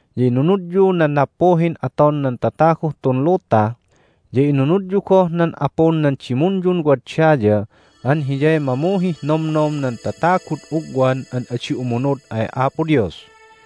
Ya inunudyu nan nappuhin aton nan tataguh tun luta, ya inunudyu goh nan apun nan dimunyun wad daya an hiyay mamuhih nomnom nan tatagud ugwan an adi umunud ay Apo Dios.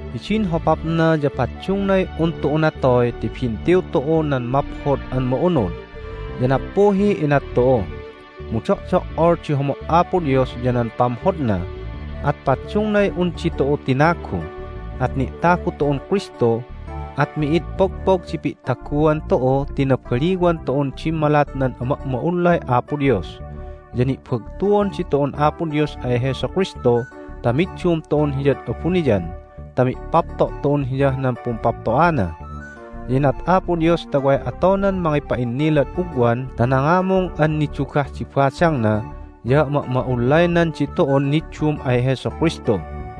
Hidin hopapna ya paddungnay un tu'u natoy ti bintiw tu'u nan Maphod an Ma'unud, ya nappuhiy inat tu'u. Mu do'do"ol di homo' Apo Dios ya nan pamhodna, at paddungnay un ditu'u tinagu, at ni'tagu tu'un Kristu, at mi'id pogpog di pi'taguan tu'u ti nabaliwan tu'un dimmalat nan ama'ma'ullay Apo Dios. Ya ni'bagtuon ditu'un Apo Dios ay Jesu Kristu ta middum tu'un Hiyad abuniyan ta mi'papto' tu'un Hiyah nan pumpapto'ana. Ya inat Apo Dios ta way atonan mangipa'innilad ugwan ta nangamung an nidugah di badangna ya ama'ma'ullaynan ditu'un niddum ay Jesu Kristu.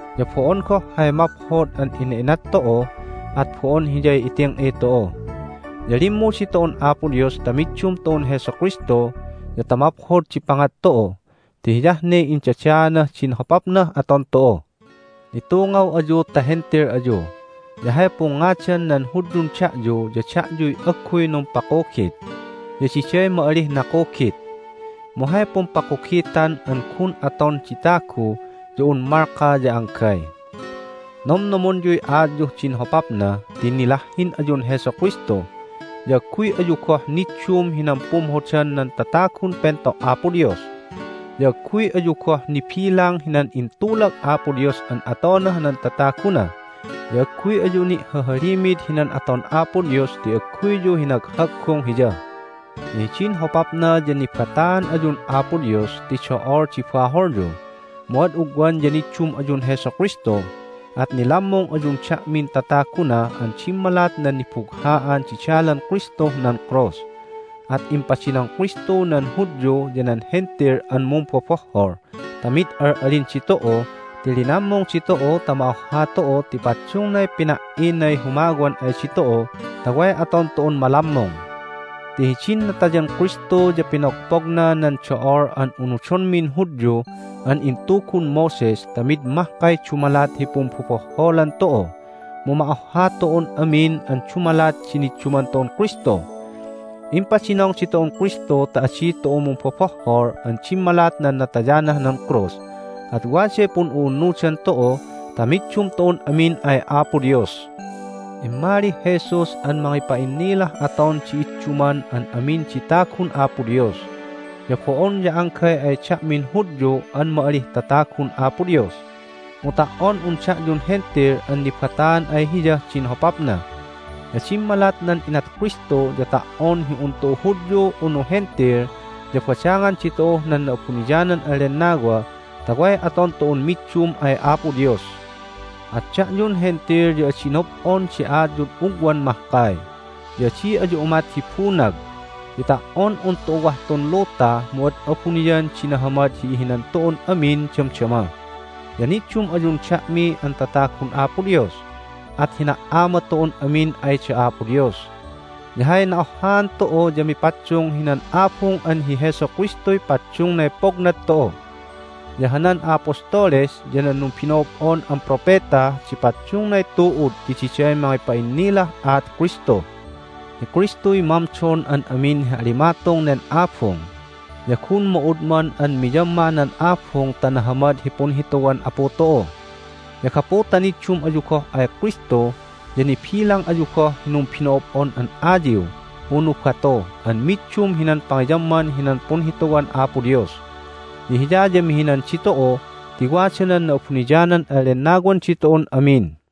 Ya bo'on goh hay maphod an ina'inat tu'u, at bo'on hiyay iting'i tu'u. Ya limmu ditu'un Apo Dios ta middum tu'un Jesu Kristu ya ta maphod di pangat tu'u, ti hiyah ne indadaanah din hopapnah aton tu'u. Nitungaw ayu ta Hentil ayu, ya hay pungngadan nan Hudyun da'yu ya da'yuy agguy numpakugit, ya diday ma'alih nakugit. Mu hay pumpakugitan an gun aton di tagu ya un malka ya anggay. Nomnomonyuy aatyuh din hopapna ti nilahhin ayun Jesu Kristu, ya agguy ayu goh niddum hinan pumhodan nan tatagun pento' Apo Dios. Ya agguy ayu goh nibilang hinan intulag Apo Dios an atonah nan tataguna, ya agguy ayu ni'hahalimid hinan aton Apo Dios ti agguyyu hinaghaggung Hiya! Ya hidin hopapna ya nibataan ayun Apo Dios ti do'ol di baholyu, mu ad ugwan ya niddum ayun Jesu Kristu, at nilammung ayun da'min tataguna an dimmalat nan nibugha'an di dalan Kristuh nan krus. At impadinong Kristu nan Hudyu ya nan Hentil an mumbobohhol ta mid al'alin ditu'u ti linammung ditu'u ta ma'ohha tu'u ti paddungnay pina"inay humawan ay ditu'u ta way aton tu'un malammung. Ti hidin natayan Kristu ya pinogpogna nan do'ol an unudonmin Hudyu an intugun Moses ta mid mahkay dumalat hi pumbobohholan tu'u, mu ma'ohha tu'un amin an dumalat di nidduman tu'un Kristu. Impadinong ditu'un Kristu ta adi tu'u mumbobohhol an dimmalat nan natayanah nan krus, at waday pun'u'unnudan tu'u ta middum tu'un amin ay Apo Dios. Immalih Jesus an mangipa'innilah aton di idduman an amin di tagun Apo Dios. Ya bo'on ya anggay ay da'min Hudyu an ma'alih tatagun Apo Dios, mu ta"on un da'yun Hentil an nibataan ay Hiyah din hopapna. Ya dimmalat nan inat Kristu ya ta"on hi un tu'u Hudyu unu Hentil ya badangan ditu'uh nan Na'abuniyanan an Lennawa ta way aton tu'un middum ay Apo Dios. At da'yun Hentil ya adi nob'on di aatyud ugwan mahkay, ya adi ayu umat hi bunag. Ti ta"on un tu'u wah tun luta mu ad abuniyan di nahamad hi ihinan tu'un amin damdama, ya niddum ayun da'mi an tatagun Apo Dios, at hina"ama tu'un amin ay da Apo Dios! Ya hay na'ohhaan tu'u ya mipaddung hinan abung an hi Jesu Kristuy paddungnay pognad tu'u. Ya hanan a'apostoles ya nan numbino'ob'on an propeta di paddungnay tu'ud ti diday mangipa'innilah aat Kristu. Hi Kristuy mamdon an amin hi alimatung nen abung, ya gun ma'udman an miyamma nan abung ta nahamad hi punhituwan Apu tu'u. Ya gapu ta niddum ayu goh ay Kristu ya nibilang ayu goh hi numbino'ob'on an ay ayiw unu batu an middum hinan pangiyamman hinan punhituwan Apo Dios. Ya Hiya ya mihinan ditu'u ti wada nan Na'abuniyanan an Lennawan ditu'un amin.